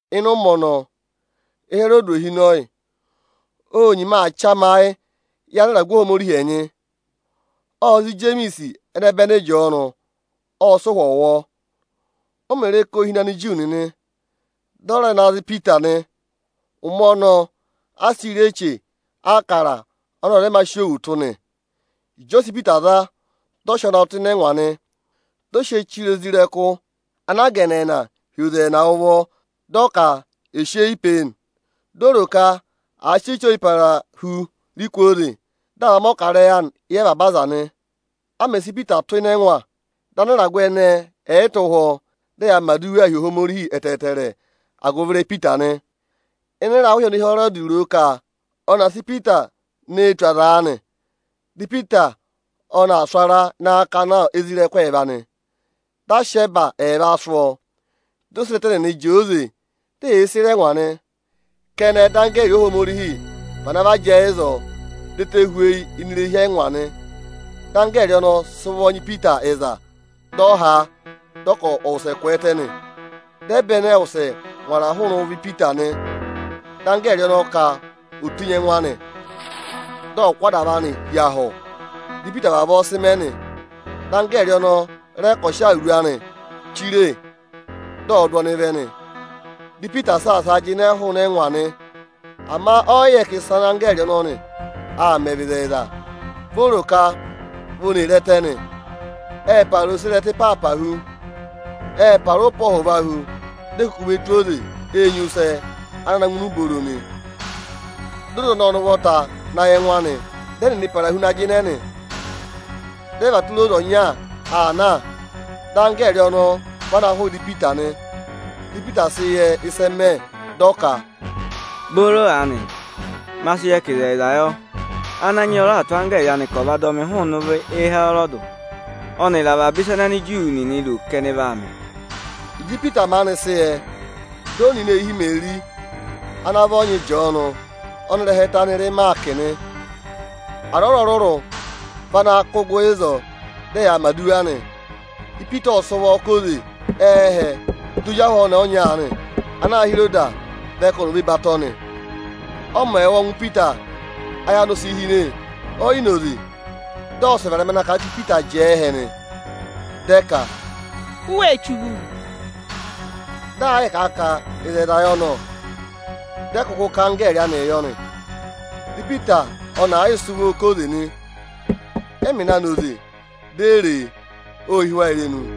Ịnị ụmẹ ọnọọ, Ịhẹrọdị ohinọyị ô nyima aa chamayịị yị anịragụ Ohomorihi ẹnyị. Ộ za Ijemiisi ẹnẹbẹnị Ịjọọnụ, ộ sị ụ̀hwọ̀ wụ̀ ọọ. O mè re ka ô hine Aniju nịnị, dị ọ rẹ na za Ipita nị. Ụmẹ ọnọọ, a sịị̄ rị Eche Ịbụrẹẹdị ọnị ọza ọ̀ yị mā sị òwù tụ́ nị. Ịjị ọ sị Ipita za, dị ọ sị ọọ na tụ́ ịnị ẹngwa nị. Dị ọ sị ọọ chire isoja nịnị ana a gà ẹnẹẹna hi oze ẹẹna ụvọ, dị ọ ka è sị eyi pe e nị. Di o ro ka àa sị Eche Ọyịparahu rị kwooze, dị à va mẹ̀ ọkarẹyị anị éyi avaba aza nị. A mẹ̀ sị Ipita tụ́ ịnị ẹngwa, dị anịragụ ẹnẹẹ ẹ̀ yị tụ́ ụhwọ́, dị ẹyaa mẹ̀ aduwaa hi Ohomorihi ẹtẹẹtẹrẹ agụvị ịrẹyị Ipita nị. Ịnị ịrahụ ịhị ọnị Ịhẹrọdị ro ka ọnị aa sị Ipita nee tù aza aanị, dị Ipita ọnị aa sụ̀ ara ịnị akakana isoja ẹẹva nịnị nị. Dị a sị ẹba ẹẹva sụ́ ọọ, di oserẹtẹ nịnị jẹẹ oze, di eyee sere ẹngwa nị. Kẹnẹ, dị anggẹẹrị Ohomorihi vana va jẹẹ ịzọọ dị ẹtẹ hweyi ini irehi ẹngwa nị. Dị anggẹẹrị ọnọọ sị ụvọ nya Ipita ịza, dị ọ ha a, dị ọ ka ọ̀ wụsẹ kwẹẹtẹ nị. Dị ẹba ẹnẹẹ wụsẹ ngwara hụụnị ụvọ Ipita nị. Dị anggẹẹrị ọnọọ ka ò tenyi ẹngụ anị, dị ọ̀ kụ́ adava anị hi ahụ nị. Dị Ipita vavọọ mẹ nị. Dị anggẹẹrị ọnọọ rẹ ka ọ̀ sị awuru anị chire, dị ọ̀ọ dụ ọnịị vẹ nị. Ipita ộ saasaa jịnẹ hụụnị ẹngwa. Ama ọ yị yẹ ka ịsị anggẹẹrị ọnọnị aa mẹ vị ịzẹyịza, vi o ro ka vi oni ee re ẹtẹ nị. Ệ para oserẹtẹ ịpaapa hu, ệ para ụpẹ ọhụva hu, di e kuku ve tù oze enyusẹ ana na ngụ ini ubooro nị. Dị oze ọnọọ ọnị ụvọta na yị ẹngụ anị, dị ẹnịnị para hu na jịnẹ nị. Dị ẹ và tụra oze ọnya aa na, dị anggẹẹrị ọnọọ vana hụụ ịdị Ipita nị. Dị Ipita sị yẹ ịsị ẹ mẹ, dị ọ ka, “Booro aanị, ma sị yẹ ka ịzẹyịza yọ. Ananyị yị ọ raà tụ́ anggẹẹrị anị ka ọ̀ va dọ mị hụụnị ụvọ Ịhẹrọdị ọnịrị avaba ịsa ana Aniju nịnị ro ka ẹnị vaa mẹ.” Ịjị Ipita maanị sị yẹ, dị ọ nọ ini eehi Imeri ana vị ọnyị Ịjọọnụ ọnị ịrẹha ẹtẹ anị rị Ịmaakị nị. Aza ọrụrụ-ọrụrụ vị ana kụ́ gụ ịzọọ, dị ẹyaa mẹ̀ aduwa. Ipita ộ sị ụvọ ká oze ẹ́hẹ, di ozi ahụ ọnẹẹ ọnya aanị ana aā hị́ Iroda vẹ ka ọnị ò ve batọ nị. Ọ mẹ̀ wụ́ ọngwẹ Ipita, ayị anị o si hine, ọ yị na oze, dị ọ wụsẹ varẹma na kà a ka Ipita jẹẹ ẹhẹ nị. Dị ẹ ka, “U wáá rụ ụra nị?” Dị aa yịị kà a ka ịzẹyịza yọ nọ! Dị ẹ kụkụ ka anggẹẹrị anịị yọ nị. Dị Ipita ọnị aa yịị sị ụvọọ ká oze nị. Ẹ mẹ̀ na na oze, di e re e, ộ hí wa irenu.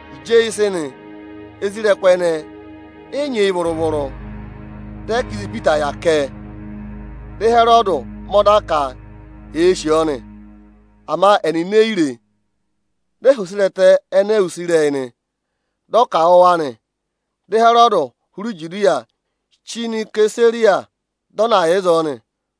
Ịjị eyi sị nị, isoja ẹnẹẹ ẹ yị nyị eyi vụrụ-vụrụ. Dị ẹ ka ịzị Ipita yà kẹ? Dị Ịhẹrọdị mẹ ọda ka èe sì ọọ nị, ama ẹnịnị e yi re e. Dị ọ họ̀ oserẹtẹ ẹnẹẹ use ịrẹyị nị. Dị ọ ka à wụ̀ wa nị. Dị Ịhẹrọdị hụrẹ Ijudiya chí nọ Isesariya, dị ọ na yà ịzọọ nị.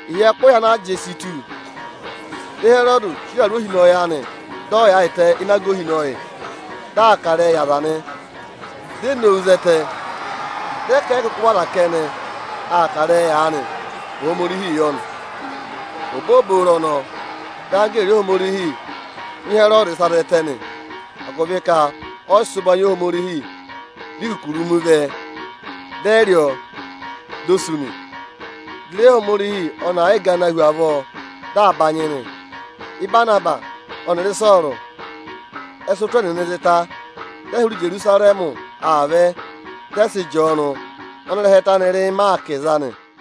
Ịhị ẹkụhị ana a jị si tù, dị Ịhẹrọdị chire awuru ohinọyị anị, dị ọ yaayịtẹ ịnị aga ohinọyị, dị aa kà ịrẹyịị yị aza nị. Di e nowu zẹtẹ, dị ẹ ka ẹ yị kụkụ vị ọza kẹnẹ aa kà ịrẹyị aanị, Ohomorihii yọ nị. Obooboro ọnọọ, dị anggẹẹrị Ohomorihi nya Ịhẹrọdị ịsa zẹtẹ nị, agụvị ka ọ yị sị ụbanyị yị Ohomorihi. Dị ikukurumi vẹ, dị ẹ rị ọọ, di o sú nị. Dị ịrẹyị Ohomorihi ọnị aa yịị ganaa hu avọọ, dị aa banyị nị. Ị́banabasị ọnịrị Ịsọọrụ mẹ̀ sị ụtụ ẹnịnị zị ta, dị ẹ hụrẹ Ijerusarẹmị aa vẹ, ệ sị Ịjọọnụ ọnị ịrẹha ẹtẹ anị rị Ịmaakị za.